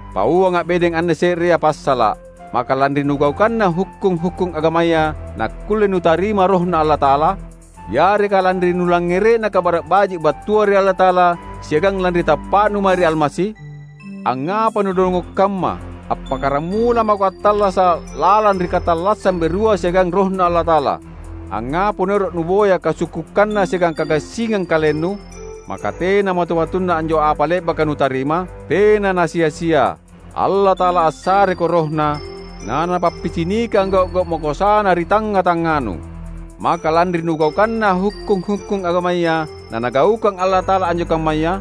Pauanga’ bedeng anne se’rea passala’: Maka lanri nugaukanna hukkung-hukkung agamaya nakkulle nutarima RohNa Allata’ala? Yareka lanri nulangngere’na Kabara’ Baji’ battua ri Allata’ala siagang lanri tappa’nu mae ri Almasi? Angngapa nudongo’ kamma! Appakkaramula mako attallasa’ lalang ri katallassang berua siagang RohNa Allata’ala; angngapa naero’ nuboya kasukkukanna siagang kagassingang kalennu? Maka tena matu-matunna anjo apa le’baka nutarima? Tena na sia-sia! Allata’ala assareko RohNa, naNapappicinikang gau’-gau’ makoasaNa ri tangnga-tangnganu. Maka lanri nugaukanna hukkung-hukkung agamaya, naNagaukang Allata’ala anjo kammaya?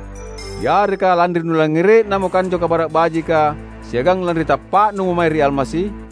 Yareka lanri nulangngere’namo anjo Kabara’ Bajika siagang lanri tappa’numo mae ri Almasi?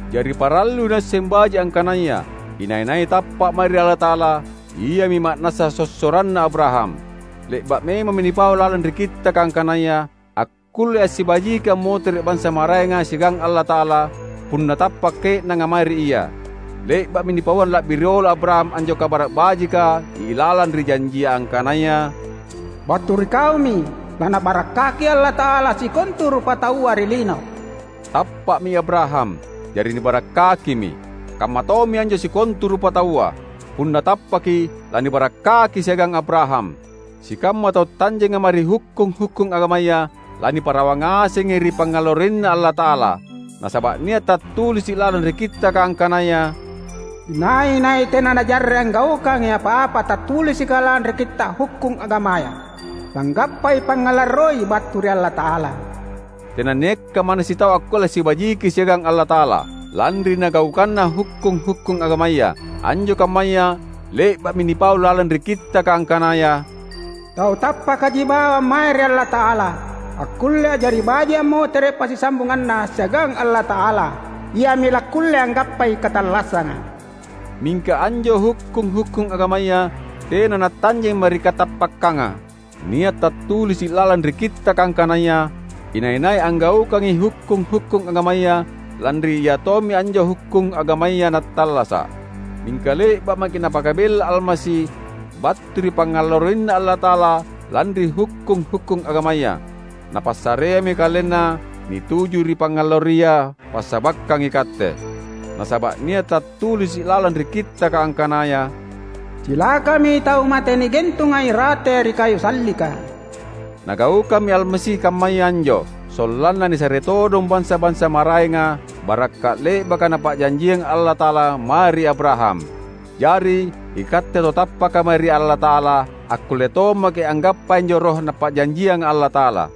Jari parallui nuasseng baji’ angkanaya, inai-nai tappa’ mae ri Allata’ala, iami ma’nassa sossoranna Abraham. Le’ba’ memammi nipau lalang ri Kittaka angkanaya akkullei assibajiki ammotere’ bansa maraenga siagang Allata’ala punna tappa’ ke’nanga mae ri Ia. Le’ba’mi nipauang la’bi riolo Abraham anjo Kabara’ Bajika ilalang ri janji angkanaya, "Battu ri kaumi nalaNabarakkaki Allata’ala sikontu rupataua ri lino." Tappa’mi Abraham, jari nibarakkakimi. Kammatommi anjo sikontu rupataua. Punna tappaki, lanibarakkaki siagang Abraham. Sikamma tau tanjenga mae ri hukkung-hukkung agamaya, laniparawa ngasengi ri pangngalarroiNa Allata’ala. Nasaba’ nia’ tattulisi’ lalang ri Kittaka angkanaya, "Inai-nai tena najarre’ anggaukangi apa-apa tattulisika lalang ri Kitta’ Hukkung Agamaya, langgappai pangngalarroi battu ri Allata’ala!" Tenanniakka manna sitau akkulle assibajiki siagang Allata’ala, lanri nagaukanna hukkung-hukkung agamaya. Anjo kammaya le’ba’mi nipau lalang ri Kittaka angkanaya, "Tau tappakaji bawang mae ri Allata’ala akkulle a’jari baji’ ammotere’ passisambunganna siagang Allata’ala; iami lakkulle anggappai katallassanga!" Mingka anjo hukkung-hukkung agamaya tena natanjeng mae ri katappakkanga. Nia’ tattulisi’ lalang ri Kittaka angkanaya inai-nai anggaukangi hukkung-hukkung agamaya, lanri iatommi anjo hukkung agamaya nattallasa’. Mingka le’ba’ maki’ Napakabella Almasi battu ri pangngalarroiNa Allata’ala lanri hukkung-hukkung agamaya. Napassareammi KalenNa nituju ri pangngalarroia passabakkang ikatte. Nasaba’ nia’ tattulisi’ lalang ri Kittaka angkanaya, "Cilakami tau mate nigentunga irate ri kayu sallika." Nagaukammi Almasi kammaya anjo, sollanna nisare todong bansa-bansa maraenga barakka’ le’baka Napa’janjiang Allata’ala mae ri Abraham. Jari, ikatte tau tappaka mae ri Allata’ala, akkulle tommaki’ anggappai anjo Roh Napa’janjianga Allata’ala.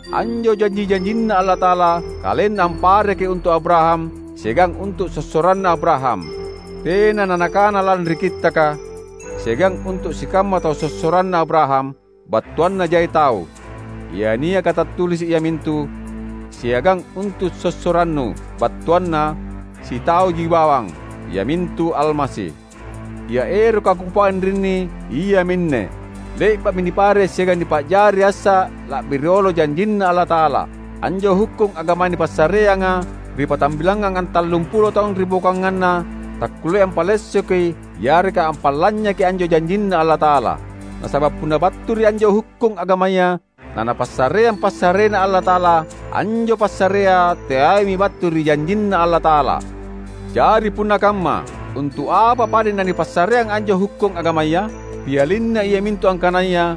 Anjo janji-janjinNa Allata’ala, KalenNa ampareki untu’ Abraham siagang untu’ sossoranna Abraham. Tena nanakana lalang ri Kittaka, "siagang untu’ sikamma tau sossoranna Abraham," battuanna jai tau. Ia niaka tattulisi’ iamintu, "siagang untu’ sossorannu," battuanna sitauji bawang, iamintu Almasi. Ia eroka kupau anrinni, iaminne: le’ba’mi nipare’ siagang nipa’jari assa la’bi riolo janjinNa Allata’ala. Anjo hukkung agama nipassareanga ri patambilangngang antallumpulo taung ribokoanganna, takkulleai ampalessoki yareka ampalanynyaki anjo janjinNa Allata’ala. Nasaba’ punna battu ri ia anjo hukkung agamaya naNapassareang passareNa Allata’ala, anjo passarea teaimi battu ri janjinNa Allata’ala. Jari punna kamma, untu’ apa padeng nanipassareang anjo hukkung agamaya? Pialinna iamintu angkanaya,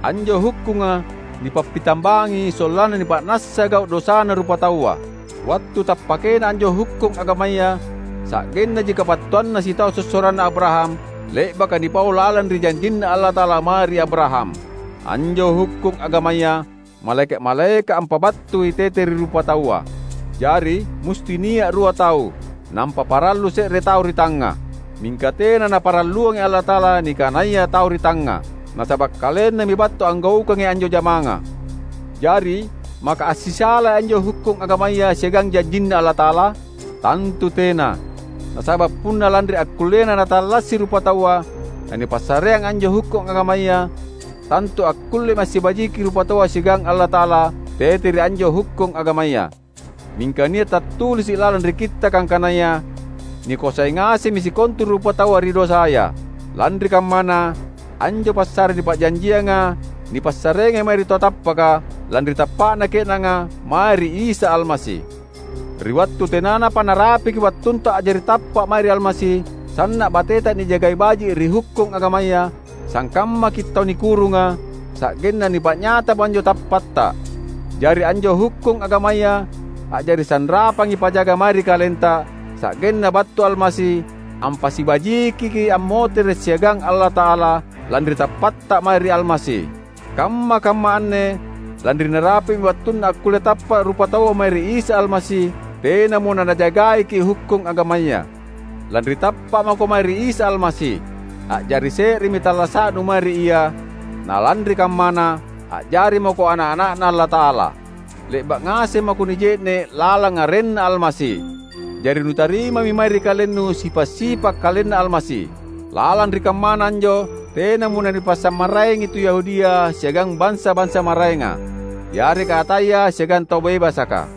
anjo hukkunga nipappitambangi sollanna nipa’nassa gau’ dosana rupataua. Wattu tappakena anjo hukkung agamaya sa’gennaji kabattuanna sitau sossoranna Abraham le’baka nipau lalang ri janjinNa Allata’ala mae ri Abraham. Anjo hukkung agamaya, malaeka’-malaeka’ ampabattui tete ri rupataua. Jari, musti nia’ rua tau, nampa parallu se’re tau ri tangnga. Mingka tena Naparalluangi Allata’ala nikanaya tau ri tangnga, nasaba’ KalenNami battu anggaukangi anjo jamanga. Jari maka assisalai anjo hukkung agamaya siagang janjinNa Allata’ala? Tantu tena! Nasaba’ punna lanri akkullena natallasi rupataua nanipassareang anjo hukkung agamaya, tantu akkullemi assibajiki rupataua siagang Allata’ala tete ri anjo hukkung agamaya. Mingka nia’ tattulisi’ lalang ri Kittaka angkanaya nikoasai ngasemmi sikontu rupataua ri dosaya. Lanri kammana, anjo passare nipa’janjianga nipassareangi mae ri tau tappaka, lanri tappa’na ke’nanga mae ri Isa Almasi. Ri wattu tenanapa narapiki wattunta a’jari tappa’ mae ri Almasi, sanna’ bateta nijagai baji’ ri hukkung agamaya; sangkammaki’ tau nikurunga, sa’genna nipa’nyatamo anjo tappatta. Jari anjo hukkung agamaya a’jari sanrapangi pajaga mae ri kalenta, sa’genna battu Almasi ampassibajikiki’ ammotere’ siagang Allata’ala, lanri tappatta mae ri Almasi. Kamma-kamma anne, lanri narapi’mi wattunna akkulle tappa’ rupataua mae ri Isa Almasi, tenamo nanajagaiki’ hukkung agamaya. Lanri tappa’ mako mae ri Isa Almasi, a’jari se’remi tallasa’nu mae ri Ia; na lanri kammana, a’jari mako ana’-ana’Na Allata’ala. Le’ba’ ngaseng mako nije’ne’ lalang arenNa Almasi; jari nutarimami mae ri kalennu sipa’-sipa’ KalenNa Almasi. Lalang ri kammana anjo tenamo nanipasimmaraengi tu Yahudia siagang bansa-bansa maraenga, yareka ataya siagang tau bebasaka,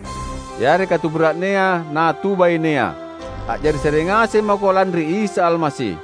yareka tu bura’nea na tu bainea. A’jari se’re ngaseng mako lanri Isa Almasi.